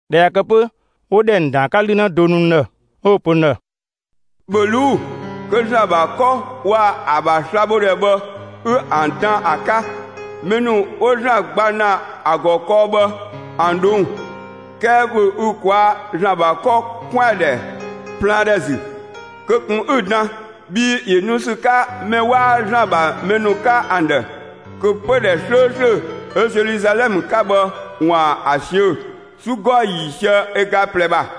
꞊Dhɛ ꞊ya kë 'pö, 'wo ‑dhɛ ‑nu ‑dan ‑a 'ka 'lü 'në do nu n ‑dhë 'ö 'wo‑ pö n ‑dhë: «‑Bhö ꞊luu'‑, kö ‑Zlan ‑bha 'kɔ waa‑ ‑a ‑bha slabhodhɛ bhë, 'ü ‑an dan ‑a 'ka; mɛ ‑nu 'wo ‑Zlan gba ‑na ‑a ‑gɔ kɔɔ bhë ‑an ꞊dhong'‑! 'Kɛɛ ‑bhö ü ꞊kwaa' ‑Zlan ‑bha 'kɔ 'kwɛandhɛ plaandhɛ ‑zü; kö ꞊kun 'ü‑ dan, bhii ‑yö nu ‑sü 'ka mɛ 'waa ‑Zlan ‑bha mɛ ‑nu 'ka ‑an ‑dhë, kö pödhɛ 'slööslö 'ö Zeluzalɛmë 'ka bhë ‑waan ‑a ꞊siö'‑ 'su 'gɔɔ‑ ‑yiisië ö ga ꞊plɛ ‑bha.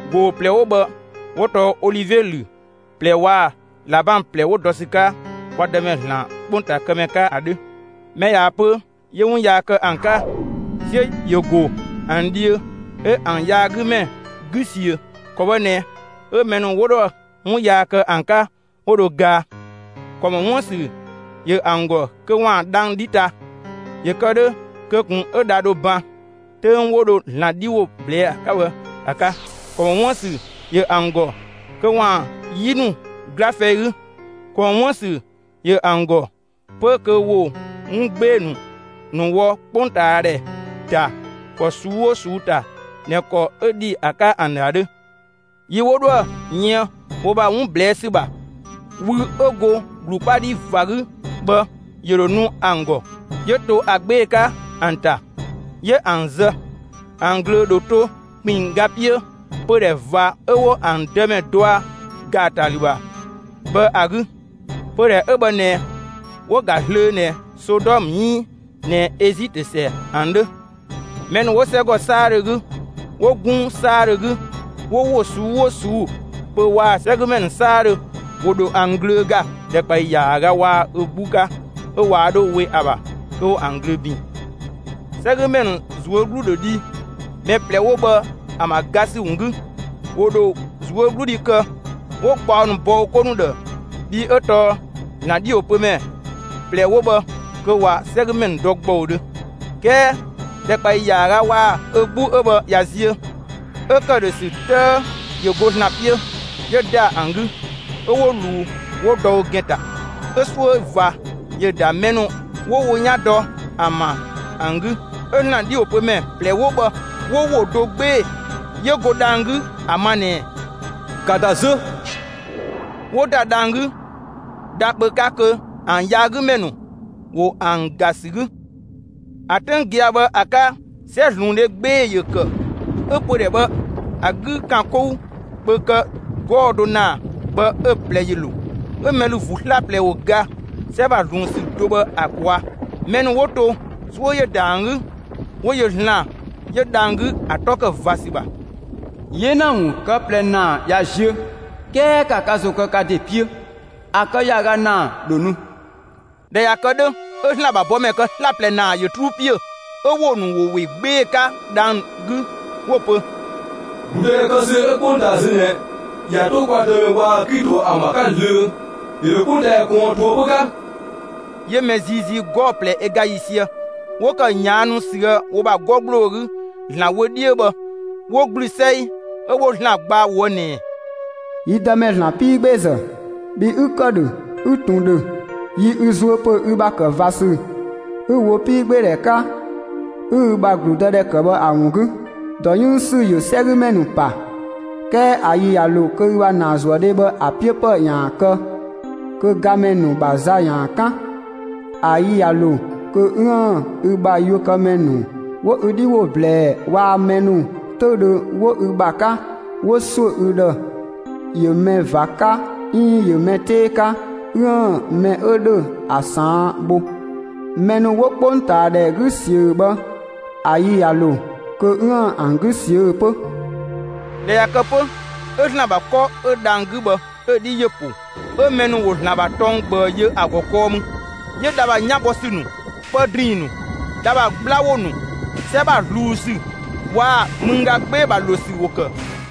꞊Goo‑ ꞊plɛ 'wo bhë 'wo tɔɔ olivie ‑lü ꞊plɛ waa‑ ꞊labang ꞊plɛ 'wo dɔ ‑sü 'ka kwa Dëmɛ ‑Zlan 'ö 'kpongtaa kë ‑mɛ 'ka ‑a 'dhö. Mɛ ꞊yaa‑ pö 'yö 'wun yaa kë ‑an 'ka, 'siö ‑yö ‑go ‑an dhiö 'ö ‑an yaagümɛ 'gü ꞊siö; ‑kɔ bhë ꞊nɛ 'ö mɛ ‑nu 'wo 'dhoë‑ 'wun yaa kë ‑an 'ka 'wo dho gaa. ‑Kɔ ‑mɔ 'wuën‑ ‑sü ‑yö ‑an ‑gɔ kö ‑waan dhang‑ 'dhi ta, ‑yö kë 'dhö kö ꞊kun 'ö dha dho ban 'töng 'wo dho ‑Zlan 'dhi ‑wo ꞊blɛɛ ‑a 'ka bhë ‑a 'ka; ‑kɔ ‑mɔ 'wuën‑ ‑sü ‑yö ‑an ‑gɔ kö ‑waan 'yi ‑nu 'gla fɛi 'gü. ‑Kɔ ‑mɔ 'wuën‑ ‑sü ‑yö ‑an ‑gɔ 'pö kö ‑wo 'wun 'gbee‑ ‑nu wɔ 'kpongtaadhɛ ‑ta ‑kɔ ꞊suu'‑ 'oo ꞊suu'‑ ‑ta ꞊nɛ ‑kɔ 'ö ‑dhi ‑a 'ka ‑an ‑dhë ‑a 'dhö. Yi 'wo 'dhoë‑ yën wo ‑bha 'wun ꞊blɛɛ' ‑sü ‑bha, wü 'ö go ‑glu 'kpa 'dhi ꞊va 'gü bhë ‑yö ‑dho nu ‑an ‑gɔ. 'Yö to ‑a 'gbee‑ 'ka ‑an ‑ta; 'yö ‑an zë. ‑An ꞊glöö ‑dho to ‑kpinngga 'piö pödhɛ ꞊va 'ö 'wo ‑an Dëmɛ dɔa ‑gaatalü ‑bha bhë ‑a 'gü. Pödhɛ 'ö bhë ꞊nɛ 'wo‑ ‑ga zlöö ꞊nɛ Sodɔmë 'iin ꞊nɛ Ezitö ‑sɛ ‑an 'dhö. Mɛ ‑nu 'wo 'sɛgɔ 'saadhö 'gü, 'wo 'gunng 'saadhö 'gü, 'wo ‑wo ꞊suu'‑ 'oo ꞊suu'‑ pö waa‑ 'sɛgümɛ ‑nu 'saadhö ‑wo ‑dho ‑an ꞊glöö ‑ga ‑dhɛkpaɔyi ‑yaaga waa‑ ö 'gbu 'ka 'ö waa 'dho 'we ‑a ‑bha kö ‑wo ‑an ꞊glöö ‑bin. 'Sɛgümɛ ‑nu ꞊zuö' 'glu dho dhi mɛ ꞊plɛ 'wo bhë ‑an ‑bha ga ‑sü ‑wun 'gü. ‑Wo ‑dho ꞊zuögludhi kë, 'wo gbaɔ ‑nu bɔ wo 'ko ‑nu ‑dhë, bhii 'ö tɔɔ ‑Zlan 'dhiwopömɛ ꞊plɛ 'wo bhë kö ꞊wa 'sɛgümɛ ‑nu dɔ ‑gbɔudhö. 'Kɛɛ ꞊dhɛ ‑dhɛkpaɔyi ‑yaaga waa‑ ö 'gbu 'ö bhë ꞊ya ziö, 'ö ‑këdhösü 'tëë 'yö go ‑Zlan 'piö 'yö ‑da ‑an 'gü, 'ö 'wo ꞊luu 'wo dɔ wo ‑gɛn ‑ta. 'Ö 'suö ꞊va ‑yö ‑da mɛ ‑nu 'wo wo 'yan dɔ ‑an ‑bha ‑an 'gü. 'Ö ‑Zlan 'dhiwopömɛ ꞊plɛ 'wo bhë 'wo ‑wo do 'gbee‑ 'yö go dhang‑ 'gü ‑a ma ꞊nɛɛ: «‑Ka ‑da zö!» 'Wo ‑da dhang‑ 'gü, dha kpö 'ka kö ‑an yaagümɛ ‑nu ‑wo ‑an ‑ga ‑sü 'gü. ‑A 'töng gia‑ bhë ‑a 'ka 'sɛzluundhe 'gbee‑ ‑yö ‑kë; 'ö pödhɛ bhë ‑a 'gü ‑kan 'kou kpö kë 'gɔɔ‑ do ‑naa bhë 'ö‑ 'plɛ ‑yö ‑lo. 'Ö mɛ ‑lü ‑vuu 'slaplɛ ‑wo ga 'sɛ ‑bha ꞊zluun ‑sü do bhë ‑a ꞊kwaa'. Mɛ ‑nu 'wo to, 'suö ‑yö ‑da ‑an 'gü; 'wo yö ‑Zlan 'yö dhang‑ 'gü ‑a 'tɔ ‑kë ꞊va ‑sü ‑bha. 'Yena ‑wun kë ꞊plɛ ‑naa ꞊ya ziö; ('kɛɛ ‑ka ka ‑zo kë ka ‑de 'piö!) ‑A kë ‑yaaga ‑naa ‑dho nu. ꞊Dhɛ ꞊ya kë 'dhö, 'ö ‑Zlan ‑bha bɔmɛ kë 'slaplɛ ‑naa ‑yö 'truu ‑piö; 'ö ‑wo ‑nu ‑wo ‑we 'gbee‑ 'ka dhang‑ 'gü 'wo‑ pö: «‑Gludëdhɛ kë ‑sü 'ö 'kpongtaa zö ꞊nɛ ꞊ya 'to kwa Dëmɛ waa‑ Klito ‑an ‑bha 'ka zlöö. ‑Yö ‑dho 'kpongtaadhɛ ꞊kɔɔn ꞊toëpö 'ka!» 'Yö mɛ ziizii 'gɔɔ‑ ꞊plɛ ö ga ‑yiisië 'wo ‑kë ꞊yaannu ꞊süë' wo ‑bha 'gɔ ‑gbloo 'gü ‑Zlan wö 'dhiö bhë 'wo ‑gblü 'sɛi, 'ö 'wo ‑Zlan gba ꞊woë' ꞊nɛɛ: «Yi Dëmɛ ‑Zlan 'piigbeezë, bhi 'ü ‑kë ‑dhö, 'ü ꞊tun ‑dhö, yi ü zuö ‑pö ü ‑bha ‑kë ꞊va ‑sü 'ü‑ wo 'piigbeedhɛ 'ka, 'ü ü ‑bha ‑gludëdhɛ ‑kë bhë ‑a ‑wun 'gü. ‑Dɔ 'yënng ‑sü ‑yö 'sɛgümɛ ‑nu ‑pa; 'kɛɛ ‑a yi ꞊ya ‑lo kö ü ‑bha ‑naazuëdhe bhë ‑a 'piö ‑pë ‑yaan kë kö gamɛ ‑nu ‑bha za ‑yaan 'kan. ‑A yi ꞊ya ‑lo kö 'üën‑ ü bha yuökëmɛ ‑nu 'wo ü 'dhi ‑wo ꞊blɛɛ waa‑ mɛ ‑nu 'töüdhö 'wo ü ‑bha 'ka 'wo ‑suö ü ‑dhë ‑yö mɛ ꞊va 'ka 'iin ‑yö mɛ 'tee 'ka 'üën‑ mɛ 'ö ‑dhö ‑a ꞊saan' bho. Mɛ ‑nu 'wo 'kpongtaadhɛ 'gü ꞊siö bhë, ‑a yi ꞊ya ‑lo kö 'üën‑ ‑an 'gü ꞊siö'‑ 'pö.» ꞊Dhɛ ꞊ya kë 'pö 'ö ‑Zlan ‑bha 'kɔ 'ö dhang‑ 'gü bhë, 'ö‑ 'dhi ‑yö ‑po. 'Ö mɛ ‑nu ‑wo ‑Zlan ‑bha tɔng ꞊gbëü yö ‑a ‑gɔ kɔɔ mü. 'Yö dha ‑bha 'yan bɔ ‑sü ‑nu, pë ‑drinng ‑nu, dha ‑bha 'gbla ‑wo ‑nu, 'sɛ ‑bha ꞊zluun ‑sü waa‑ mëngga 'gbee‑ ‑bha ‑lo ‑sü ‑wo ‑kë.